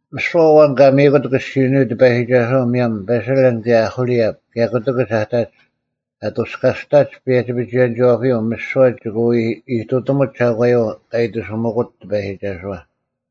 ᒥᓯᐛ ᐊᐛᓐ ᑲ ᒥᔨᑯᑦ ᑭᔅᒋᐅᓂᔪᐤ ᑎᐸᔨᒋᒐᓱᐛ ᒧᔭᒻ ᐸᓴᓕᓪ ᑭᔭ ᐅᐦᐅᓕᐊᑉ ᑭᔭ ᑯᑎᑭᒡ ᐊᑕᒡ, ᐊᑐᔅᑲᔅᑕᒡ ᐸᔭᒋ-ᐱᒍᐎᔭᓂᒋᐛᐱᔪᐤ ᒥᓯᐛ ᒋᑭ ᐎ ᐃᑐᑎᒧᒡ ᒐᒂᔪᐤ ᑲ ᐃᑎᓱᒥᑯᒡ ᑎᐸᔨᒋᒐᓱᐛ᙮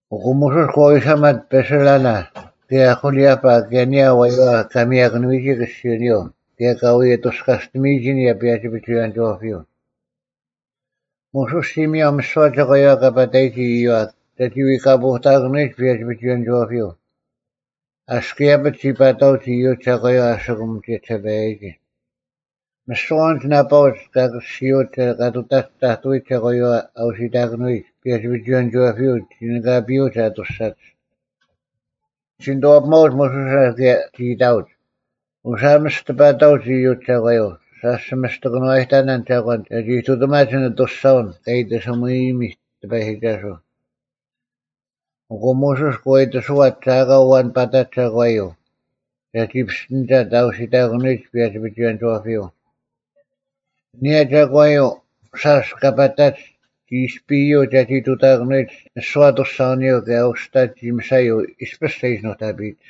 ᐊᑯ ᒧᓱᔅ ᒂ ᐎᓴᒪᑦ ᐸᓴᓕᓚ ᑭᔭ ᐅᐦᐅᓕᐊᐸ ᑭᔭ ᐊᓂᔭ ᐊᐛᔪᐛ ᑲ ᒥᔭᑭᓄᐎᔨᒋ ᑭᔅᒋᐅᓂᔪᐤ ᑭᔭ ᑲ ᐎ ᐊᑐᔅᑲᔅᑎᒥᔨᒋ ᐊᓂᔭ ᐸᔭᒋ-ᐱᒍᐎᔭᓂᒋᐛᐱᔪᐤ᙮ ᒧᓱᔅ ᒋ ᒥᔭᐤ ᒥᓯᐛ ᒐᒂᔪᐛ ᑲ ᐸᑕᔨᒋ ᐃᔪᐛ ᒐᒋ ᐎᑲᐳᐎᑕᑭᓄᐎᒡ ᐸᔭᒋ-ᐱᒍᐎᔭᓂᒋᐛᐱᔪᐤ᙮ ᐊᔅᒄ ᐃᔭᐱᒡ ᒋ ᐸᑕᐅᒡ ᐃᔪᒡ ᒐᒂᔪᐛ ᐊᓯᑯᒻ ᒋᔭᒋᓴᐸᔭᒋ᙮ ᒥᓯᐛ ᐊᓐᒡ ᓇᐸᐅᒡ ᑲ ᑭᔅᒋᐅᒡ ᑲ ᑐᑕᒡ ᑕᑐᐎᒡ ᒐᒂᔪᐛ ᐊ ᐅᓯᑕᑭᓄᐎᒡ ᐸᔭᒋ-ᐱᒍᐎᔭᓂᒋᐛᐱᔪᐤ ᒋᓂᑲᐱᔪᐅᒡ ᐊᑐᔅᒐᒡ᙮ ᒋ ᓂᑐᐛᐱᒪᐅᒡ ᒧᓱᓴ ᑭᔭ ᒋ ᐃᑕᐅᒡ, “ᐅᓴᒻ ᒥᔅᑎᐸᑕᐅᒡ ᐃᔪᒡ ᒐᒂᔪᐤ, ᓴᔅ ᒋ ᒥᔅᑎ ᑭᓄᐛᔨᑕᓇᓐ ᒐᒂᓐ ᒐᒋ ᐃᑐᑎᒪᒡ ᐊᓐ ᐊᑐᔅᒐᐅᓐ ᑲ ᐃᑎᓱᒥᔨᒥᑦ ᑎᐸᔨᒋᒐᓱᐤ᙮” ᐊᑯ ᒧᓱᔅ ᒂ ᐃᑎᓱᐛᑦ ᒐ ᐊᑲ ᐊᐛᓐ ᐸᑕᑦ ᒐᒂᔪᐤ ᒐᒋ ᐱᔅᑎᓂᒐᑦ ᐊ ᐅᓯᑕᑭᓄᐎᒡ ᐸᔭᒋ-ᐱᒍᐎᔭᓂᒋᐛᐱᔪᐤ, ᐊᓂᔭ ᒐᒂᔪᐤ ᓴᔅ ᑲ ᐸᑕᒡ ᒋ ᐃᔅᐱᔪᐤ ᒐᒋ ᑐᑕᑭᓄᐎᒡ ᒥᓯᐛ ᐊᑐᔅᒐᐅᓂᔪᐤ ᑭᔭ ᐅᔅᑕ ᒋ ᒥᓴᔪᐤ ᐃᔅᐱᔅ ᒐ ᐃᓯ ᓄᑕᐱᔨᒡ᙮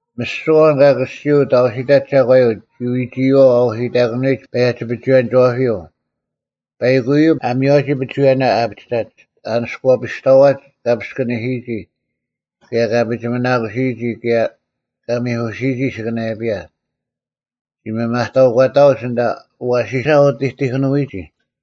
ᒥᓯᐛ ᐊᐛᓐ ᑲ ᑭᔅᒋᐅᑦ ᐊ ᐅᓯᑕᑦ ᒐᒂᔪᐤ ᒋ ᐎᒋᐃᐛᐤ ᐊ ᐅᓯᑕᑭᓂᐎᒡ ᐸᔭᒋ-ᐱᒍᐎᔭᓂᒋᐛᐱᔪᐤ᙮ ᐸᐃᑯᔪᐤ ᐊ ᒥᔽᓯᔨᒋ ᐱᒍᐎᔭᓇ ᐊ ᐊᐱᒋᑕᒡ, ᐊ ᓂᔅᑯᐛᐱᔅᑕᐛᒡ ᑲ ᐱᔅᑭᓂᓯᔨᒋ ᑭᔭ ᑲ ᐱᒋᒥᓇᑯᓯᔨᒋ ᑭᔭ ᑲ ᒥᐧᑯᓯᔨᒋ ᐊᓯᑭᓇᔭᐱᔭ᙮ ᒐ ᒥᒪᑕᐅᒂᑕᐅᒡ ᐊᓐᑕ ᐊᐛᓯᓴ ᐊ ᐅᑎᑎᑭᓄᐎᒋ᙮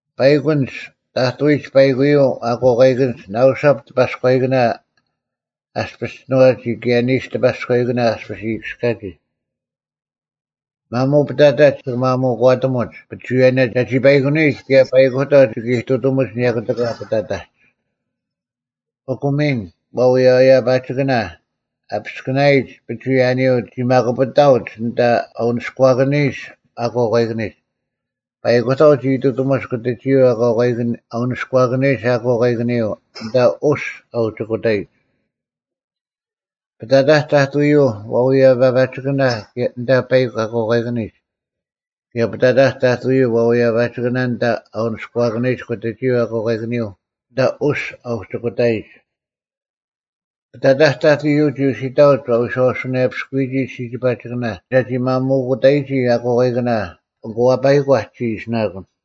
ᐸᐃᒄ ᐊᓐᒡ ᑕᑐᐎᒡ ᐸᐃᑯᔪᐤ ᐊᑯᐛᑲᐃᑭᓐᒡ ᓇᐅᓴᑉ ᑎᐸᔎᐃᑭᓇ ᐊᔅᐱᔅ ᒋᓏᒋ ᑭᔭ ᓂᓱ ᑎᐸᔎᐃᑭᓇ ᐊᔅᐱᔅ ᐃᔨᑭᔅᑲᒋ᙮ ᒪᒧᐤ ᐱᑕᑕᒡ ᒋᑭ ᒪᒧᒂᑎᒧᒡ ᐱᒍᐎᔭᓇ ᒐᒋ ᐸᐃᑯᓂᔨᒡ ᑭᔭ ᐸᐃᑯᑕᐤ ᒋᑭ ᐃᑐᑎᒧᒡ ᐊᓂᔭ ᑯᑎᑲ ᐱᑕᑕᒡ᙮ ᐊᑯ ᒥᓐ ᐛᐅᔭᔭᐸᒋᓂᑭᓇ ᐊ ᐱᔅᑭᓇᔨᒡ ᐱᒍᐎᔭᓂᔪᐤ ᒋ ᒪᑯᐱᑕᐅᒡ ᐊᓐᑕ ᐊ ᐅᓂᔎᑭᓂᔨᒡ ᐊᑯᐛᑲᐃᑭᓂᒡ᙮ ᐸᐃᑯᑕᐤ ᒋ ᑐᑕᒧᒡ ᑯᑎᒋᔪᐤ ᐊ ᐅᓂᔎᑭᓂᔨᒡ ᐊᑯᐛᑲᐃᑭᓂᔪᐤ ᐊᓐᑕ ᐅᔅᒡ ᐊ ᐅᒋᑯᑕᔨᒡ᙮ ᐱᑕᑕᒡ ᑕᑐᔪᐤ ᐛᐅᔭᔭᐸᒋᓂᑭᓇ ᐊᓐᑕ ᐸᐃᒄ ᐊᑯᐛᑲᐃᑭᓂᒡ ᑭᔭ ᐱᑕᑕᒡ ᑕᑐᔪᐤ ᐛᐅᔭᔭᐸᒋᓂᑭᓇ ᐊᓐᑕ ᐊ ᐅᓂᔎᑭᓂᔨᒡ ᑯᑎᒋᔪᐤ ᐊᑯᐛᑲᐃᑭᓂᔪᐤ ᐊᓐᑕ ᐅᔅᒡ ᐊ ᐅᒋᑯᑕᔨᒡ᙮ ᐱᑕᑕᒡ ᑕᑐᔪᐤ ᒋ ᐅᓯᑕᐅᒡ ᐊ ᐎᔄᐅᓱᓇᔭᐱᓯᔨᒋ ᓯᒋᐸᒋᑭᓇ ᒐᒋ ᒪᒧᑯᑕᔨᒋ ᐊᑯᐛᑲᐃᑭᓇ ᐊᑯ ᐊᐸᐃᒂᒡ ᒋ ᐃᓯᓇᑯᓐ᙮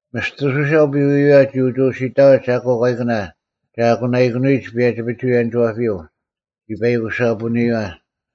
ᒥᔅᑐᓯᓴ ᐅᐱᐎᔪᐎᐛ ᒋ ᐅᒋ ᐅᓯᑕᐅᒡ ᐊᑯᐛᑲᐃᑭᓇ ᒐ ᐊᑯᓇᐃᑭᓄᐎᒡ ᐸᔭᒋ-ᐱᒍᐎᔭᓂᒋᐛᐱᔪᐤ, ᒋ ᐸᐃᑯᓴᐳᔨᐛ᙮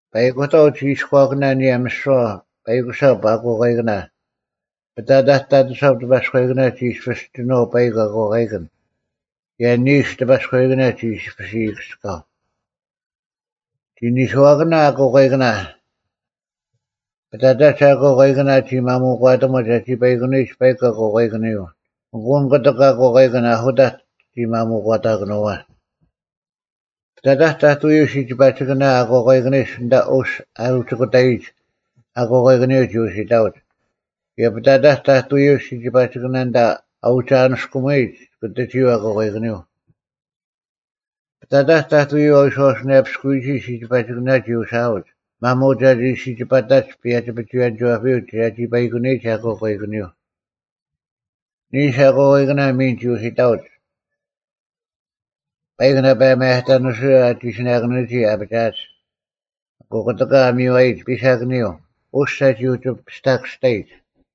ᐸᐃᑯᑕᐤ ᒋ ᐃᔎᑭᓇ ᐊᓂᔭ ᒥᓯᐛ ᐸᐃᑯᓴᑉ ᐊᑯᐛᑲᐃᑭᓇ᙮ ᐱᑕᑕᒡ ᑕᑐᓴᑉ ᑎᐸᔎᐃᑭᓇ ᒋ ᐃᔅᐱᔅ ᒋᓏᐤ ᐸᐃᒄ ᐊᑯᐛᑲᐃᑭᓐ ᑭᔭ ᓂᓱ ᑎᐸᔎᐃᑭᓇ ᒋ ᐃᔅᐱᔅ ᐃᔨᑭᔅᑲᐤ᙮ ᒋ ᓂᓱᐛᑭᓇ ᐊᑯᐛᑲᐃᑭᓇ, ᐱᑕᑕᒡ ᐊᑯᐛᑲᐃᑭᓇ ᒋ ᒪᒧᒂᑎᒧᒡ ᒐᒋ ᐸᐃᑯᓂᔨᒡ ᐸᐃᒄ ᐊᑯᐛᑲᐃᑭᓂᔪᐤ ᐊᑯ ᐊᓐ ᑯᑎᒃ ᐊᑯᐛᑲᐃᑭᓐ ᐊᓱᑕᒡ ᒋ ᒪᒧᒂᑕᑭᓄᐛ᙮ ᐱᑕᑕᒡ ᑕᑐᔪᐤ ᓯᒋᐸᒋᑭᓇ ᐊ ᐅᓂᔎᔨᒡ ᐊᓐᑕ ᐅᔅᒡ ᐊ ᐅᒋᑯᑕᔨᒡ ᐊᑯᐛᑲᐃᑭᓂᔪᐤ ᒋ ᐅᓯᑕᐅᒡ, ᑭᔭ ᐱᑕᑕᒡ ᑕᑐᔪᐤ ᓯᒋᐸᒋᑭᓇ ᐊᓐᑕ ᐊ ᐅᒋ ᐊᓂᔅᑯᒧᐎᒡ ᑯᑎᒋᔪᐤ ᐊᑯᐛᑲᐃᑭᓂᔪᐤ᙮ ᐱᑕᑕᒡ ᑕᑐᔪᐤ ᐊ ᐎᔄᐛᐱᔅᑯᔨᒋ ᓯᒋᐸᒋᑭᓇ ᒋ ᐅᓯᐊᐅᒡ ᒪᒧᐤ ᒐᒋ ᓯᒋᐸᑕᒡ ᐸᔭᒋ-ᐱᒍᐎᔭᓂᒋᐛᐱᔪᐤ ᒐᒋ ᐸᐃᑯᓂᔨᒡ ᐊᑯᐛᑲᐃᑭᓂᔪᐤ᙮ ᓂᓱ ᐊᑯᓇᐃᑭᓇ ᒥᓐ ᒋ ᐅᓯᑕᐅᒡ᙮ ᐸᐃᒄ ᓇᐸ ᒪᔭᑕᓂᓱᐎᔭᓇ ᐊ ᒋᓯᓇᑭᓄᐅᒋ ᐊᐱᒋᐊᒡ᙮ ᐊᑯ ᑯᑎᑲ ᐊ ᒥᔽᔨᒡ ᐱᓴᑭᓂᔪᐤ, ᐅᔅᒡ ᒐᒋ ᐅᒋ ᐱᔅᑕᑭᔅᑕᔨᒡ᙮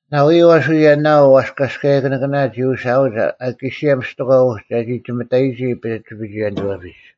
ᓇᐎᔪᐤ ᐊᓱ ᔭᓇᐤ ᐛᔅᑲᔭᔅᑯᓂᑭᓇ ᒋ ᐅᓯᐊᐅᒡ ᐊᑲᓯᔭ ᒥᔅᑎᒂ ᐅᒡ ᒐᒋ ᒋᒥᑕᔨᒋ ᐸᔭᒋ-ᐱᒍᐎᔭᓂᒋᐛᐱᒡ᙮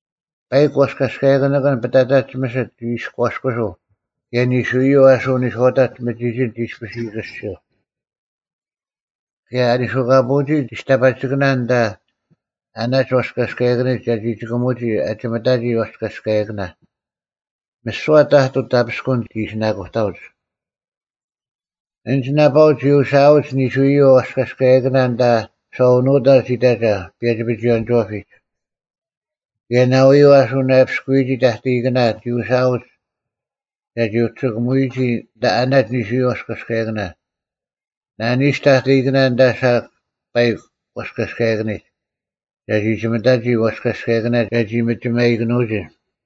ᐸᐃᒄ ᐛᔅᑲᔭᔅᑯᓂᑭᓐ ᐱᑕᑕᒡ ᒥᓯᑦ ᒋ ᐃᔎᔅᑯᓱᐤ ᑭᔭ ᓂᓱᔪᐤ ᐊᓱ ᓂᔄᐅᑕᒡ ᒥᒋᒋᓐ ᒋ ᐃᔅᐱᔅ ᐃᔨᑭᔅᒋᔪᐤ᙮ ᑭᔭ ᐊ ᓂᓱᑲᐳᐅᒋ ᒋᔅᑕᐸᒋᑭᓇ ᐊᓐᑕ ᐊᓇᒡ ᐛᔅᑲᔭᔅᑯᓂᑭᓂᒡ ᒐᒋ ᒪᒧᑭᒧᒋ ᐊᒋᒥᑕᒋ ᐛᔅᑲᔭᔅᑯᓂᑭᓇ᙮ ᒥᓯᐛ ᑕᑐᐤ ᑕᐱᔅᑯᓐ ᒋ ᐃᓯᓇᑯᑕᐅᒡ᙮ ᐊᓐᒡ ᓇᐸᐅᒡ ᒋ ᐅᓯᐊᐅᒡ ᓂᓱᔪᐤ ᐛᔅᑲᔭᔅᑯᓂᑭᓇ ᐊᓐᑕ ᓴᐅᓄᑕᒡ ᐃᑕᒐ ᐸᔭᒋ-ᐱᒍᐎᔭᓂᒋᐛᐱᒡ᙮ ᑭᔭ ᓇᐎᔪᐤ ᐊ ᓱᓇᔭᐱᔅᑯᔨᒋ ᑕᑕᐃᑭᓇ ᒋ ᐅᓯᐊᐅᒡ ᒐᒋ ᐅᒋ ᒋᑭᒧᐎᔨᒋ ᐊᓐᑕ ᐊᓇᒡ ᓂᓱᔪᐤ ᐛᔅᑲᔭᔅᑯᓂᑭᓇ, ᓇᓂᓱ ᑕᑕᐃᑭᓇ ᐊᓐᑕ ᓴᒄ ᐸᐃᒄ ᐛᔅᑲᔭᔅᑯᓂᑭᓂᒡ, ᒐᒋ ᒋᒥᑕᒋ ᐛᔅᑲᔭᔅᑯᓂᑭᓇ ᒐᒋ ᒥᒋᒪᔨᑭᓄᐅᒋ᙮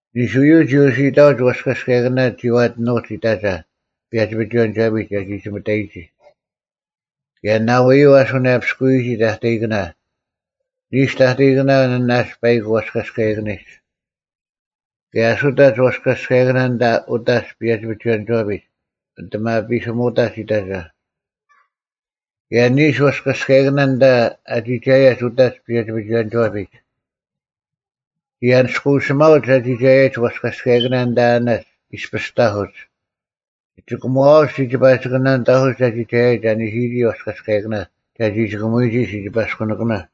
ᓂᓱᔪᐤ ᒋ ᐅᓯᑕᐅᒡ ᐛᔅᑲᔭᔅᑯᓂᑭᓇ ᒋᐛᑎᓄᒡ ᐃᑕᒐ ᐸᔭᒋ-ᐱᒍᐎᔭᓂᒋᐛᐱᒡ ᒐᒋ ᒋᒥᑕᔨᒋ᙮ ᑭᔭ ᓇᐎᔪᐤ ᐊ ᓱᓇᔭᐱᔅᑯᔨᒋ ᑕᑕᐃᑭᓇ, ᓂᓱ ᑕᑕᐃᑭᓇ ᐊᓇᒡ ᐸᐃᒄ ᐛᔅᑲᔭᔅᑯᓂᑭᓂᒡ᙮ ᑭᔭ ᐊᓱᑕᒡ ᐛᔅᑲᔭᔅᑯᓂᑭᓇ ᐊᓐᑕ ᐅᑕᒡ ᐸᔭᒋ-ᐱᒍᐎᔭᓂᒋᐛᐱᒡ, ᐊᑎᒪᐱᓯᒧᑕᒡ ᐃᑕᒐ, ᑭᔭ ᓂᓱ ᐛᔅᑲᔭᔅᑯᓂᑭᓇ ᐊᓐᑕ ᐊ ᒋᒐᔭᒡ ᐅᑕᒡ ᐸᔭᒋ-ᐱᒍᐎᔭᓂᒋᐛᐱᒡ᙮ ᒋ ᐊᓂᔅᑯᓯᒪᐅᒡ ᐊ ᒋᒐᔭᒡ ᐛᔅᑲᔭᔅᑯᓂᑭᓇ ᐊᓐᑕ ᐊᓇᒡ ᐃᔅᐱᔅ ᑕᐧᑯᒡ᙮ ᒋ ᒋᑭᒺᐅᒡ ᓯᒋᐸᒋᑭᓇ ᐊᓐᑕ ᑕᐧᑯᒡ ᐊ ᒋᒐᔭᔨᒡ ᐊ ᓂᓯᔨᒋ ᐛᔅᑲᔭᔅᑯᓂᑭᓇ ᒐᒋ ᒋᑭᒧᔨᒋ ᓯᐸᔅᑯᓂᑭᓇ᙮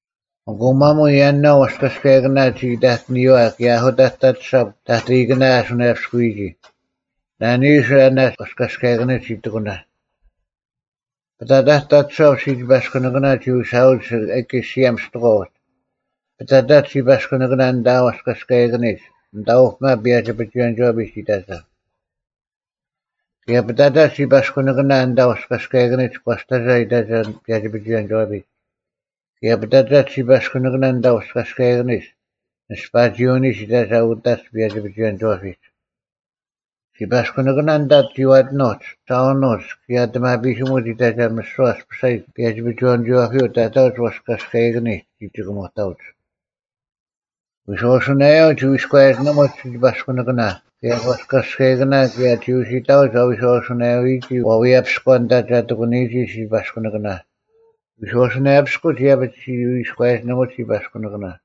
ᐊᑯ ᒪᒧᐤ ᔭᓇᐤ ᐛᔅᑲᔭᔅᑯᓂᑭᓇ ᒋ ᐃᑕᑎᓂᔨᐛ ᑭᔭ ᐊᓱᑕᒡ ᑕᑐᓴᑉ ᑕᑕᐃᑭᓇ ᐊ ᓱᓇᔭᐱᔅᑯᔨᒋ, ᓇᓂᓱ ᐊᓇᒡ ᐛᔅᑲᔭᔅᑯᓂᑭᓂᒡ ᒋ ᑎᑯᓇ᙮ ᐱᑕᑕᒡ ᑕᑐᓴᑉ ᓯᐸᔅᑯᓂᑭᓇ ᒋ ᐅᓯᐊᐅᒡ ᐊᑲᓯᔭ ᒥᔅᑎᒂ ᐅᒡ, ᐱᑕᑕᒡ ᓯᐸᔅᑯᓂᑭᓇ ᐊᓐᑕ ᐛᔅᑲᔭᔅᑯᓂᑭᓂᒡ ᐊᓐᑕ ᐅᐱᒪ ᐸᔭᒋ-ᐱᒍᐎᔭᓂᒋᐛᐱᒡ ᐃᑕᒐ, ᑭᔭ ᐱᑕᑕᒡ ᓯᐸᔅᑯᓂᑭᓇ ᐊᓐᑕ ᐛᔅᑲᔭᔅᑯᓂᑭᓂᒡ ᒂᔅᑕᒐ ᐃᑕᒐ ᐸᔭᒋ-ᐱᒍᐎᔭᓂᒋᐛᐱᒡ᙮ ᑭᔭ ᐱᑕᑕᒡ ᓯᐸᔅᑯᓂᑭᓇ ᐊᓐᑕ ᐛᔅᑲᔭᔅᑯᓂᑭᓂᒡ ᓂᔅᐸᒋᐅᓂᒡ ᐃᑕᒐ ᐅᑕᒡ ᐸᔭᒋ-ᐱᒍᐎᔭᓂᒋᐛᐱᒡ᙮ ᓯᐸᔅᑯᓂᑭᓇ ᐊᓐᑕ ᒋᐛᑎᓄᒡ, ᓴᐅᓄᒡ ᑭᔭ ᐊᑎᒪᐱᓯᒧᒡ ᐃᑕᒐ ᒥᓯᐛ ᐊᔅᐱᓴᔨᒡ ᐸᔭᒋ-ᐱᒍᐎᔭᓂᒋᐛᐱᔪᐤ ᑕᑕᐅᒡ ᐛᔅᑲᔭᔅᑯᓂᑭᓂᒡ ᒋᒋᑭᒧᑕᐅᒡ᙮ ᐎᔄᐅᓱᓇᔭᔪᐤ ᒋ ᐎᔎᔭᒋᓂᒧᒡ ᓯᐸᔅᑯᓂᑭᓇ ᑭᔭ ᐛᔅᑲᔭᔅᑯᓂᑭᓇ ᑭᔭ ᒋ ᐅᓯᑕᐅᒡ ᐊ ᐎᔄᐅᓱᓇᔭᐎᒋ ᐛᐎᔭᐱᔎ ᐊᓐᑕ ᒐ ᑎᑯᓂᔨᒋ ᓯᐸᔅᑯᓂᑭᓇ᙮ ᐎᔄᐅᓱᓇᔭᐱᔅᑯᒡ ᐃᔭᐱᒡ ᒋ ᐎᔎᔭᒋᓂᒧᒡ ᓯᐸᔅᑯᓂᑭᓇ᙮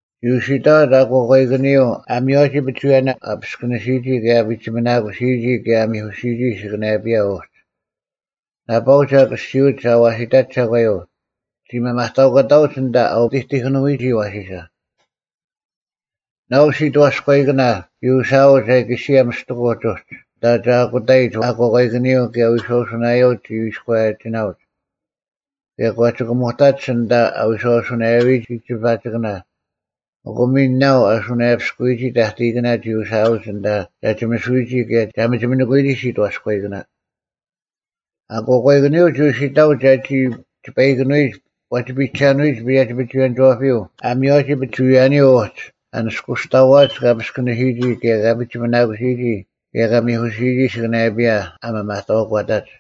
ᒋ ᐅᓯᑕᐅᒡ ᐊᑯᐛᑲᐃᑭᓂᔪᐤ ᐊ ᒥᔽᓯᔨᒋ ᐱᒍᐎᔭᓇ, ᐊ ᐱᔅᑭᓂᓯᔨᒋ ᑭᔭ ᐊ ᐱᒋᒥᓇᑯᓯᔨᒋ ᑭᔭ ᐊ ᒥᐧᑯᓯᔨᒋ ᐊᓯᑭᓇᔭᐱᔭ ᐅᒡ᙮ ᓇᐸᐅᒡ ᐊ ᑭᔅᒋᐅᒡ ᐊᐅᓯᑕᒡ ᒐᒂᔪᐤ ᒋ ᒥᒪᑕᐅᒂᑕᐅᒡ ᐊᓐᑕ ᐊ ᐅᑎᑎᑭᓄᐎᒋ ᐊᐛᓯᓴ᙮ ᓇᐤ ᓯᑥᔎᐃᑭᓇ ᒋ ᐅᓯᐊᐅᒡ ᐊᑲᓯᔭ ᒥᑎᑯᒡ ᐅᒡ ᐊᓐᑕ ᒐ ᐊᑯᑕᔨᒡ ᐊᑯᐛᑲᐃᑭᓂᔪᐤ ᑭᔭ ᐎᔄᐅᓱᓇᔭᔪᐤ ᒋ ᐎᔎᔭᒋᓇᐅᒡ, ᑭᔭ ᒂ ᒋᑭᒧᑕᒡ ᐊᓐᑕ ᐊ ᐎᔄᐅᓱᓇᔭᐎᒋ ᓯᒋᐸᒋᑭᓇ᙮ ᐊᑯ ᒥᓐ ᓇᐤ ᐊ ᓱᓇᔭᐱᔅᑯᔨᒋ ᑕᑕᐃᑭᓇ ᒋ ᐅᓯᐊᐅᒡ ᐊᓐᑕ ᒐ ᒋᒥᓱᐎᒋ ᑭᔭ ᒐ ᒥᒋᒥᓂᑯᐎᒋ ᓯᑥᔎᔨᑭᓇ᙮ ᐊᑯᐛᑲᐃᑭᓂᔪᐤ ᒋ ᐅᓯᑕᐅᒡ ᒐᒋ ᒋᐸᐃᑭᓄᐎᒡ ᐛᒋ ᐱᒐᓄᐎᔨᒡ ᐸᔭᒋ-ᐱᒍᐎᔭᓂᒋᐛᐱᔪᐤ ᐊ ᒥᔽᔨᒋ ᐱᒍᐎᔭᓂᔪᐤ ᐅᒡ ᐊ ᓂᔅᑯᐛᐱᔅᑕᐛᒡ ᑲ ᐱᔅᑭᓂᓯᔨᒋ ᑭᔭ ᑲ ᐱᒋᒥᓇᑯᓯᔨᒋ ᑭᔭ ᑲ ᒥᐧᑯᓯᔨᒋ ᐊᓯᑭᓇᔭᐱᔭ ᐊ ᒥᒪᑕᐅᒂᑕᒡ᙮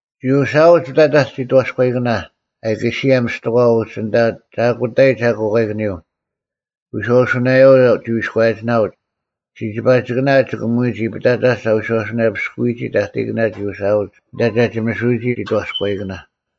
ᒋ ᐅᓯᐊᐅᒡ ᐱᑕᑕᒡ ᓯᑥᔎᐃᑭᓇ ᐊᑲᓯᐊ ᒥᔅᑎᒂ ᐅᒡ ᐊᓐᑕ ᒐ ᐊᑯᑕᐃᒡ ᐊᑯᐛᑲᐃᑭᓂᔪᐤ, ᐎᔄᐅᓱᓇᔭᔪᐤ ᒋ ᐎᔎᔭᒋᓇᐅᒡ, ᓯᒋᐸᒋᑭᓇ ᐊ ᒋᑭᒧᔨᒋ; ᐱᑕᑕᒡ ᐊ ᐎᔄᐛᐱᔅᑯᔨᒋ ᑕᑕᐃᑭᓇ ᒋ ᐅᓯᐊᐅᒡ ᐊᓐᑕ ᒐ ᒋᒥᓱᐎᔨᒋ ᓯᑥᔎᐃᑭᓇ᙮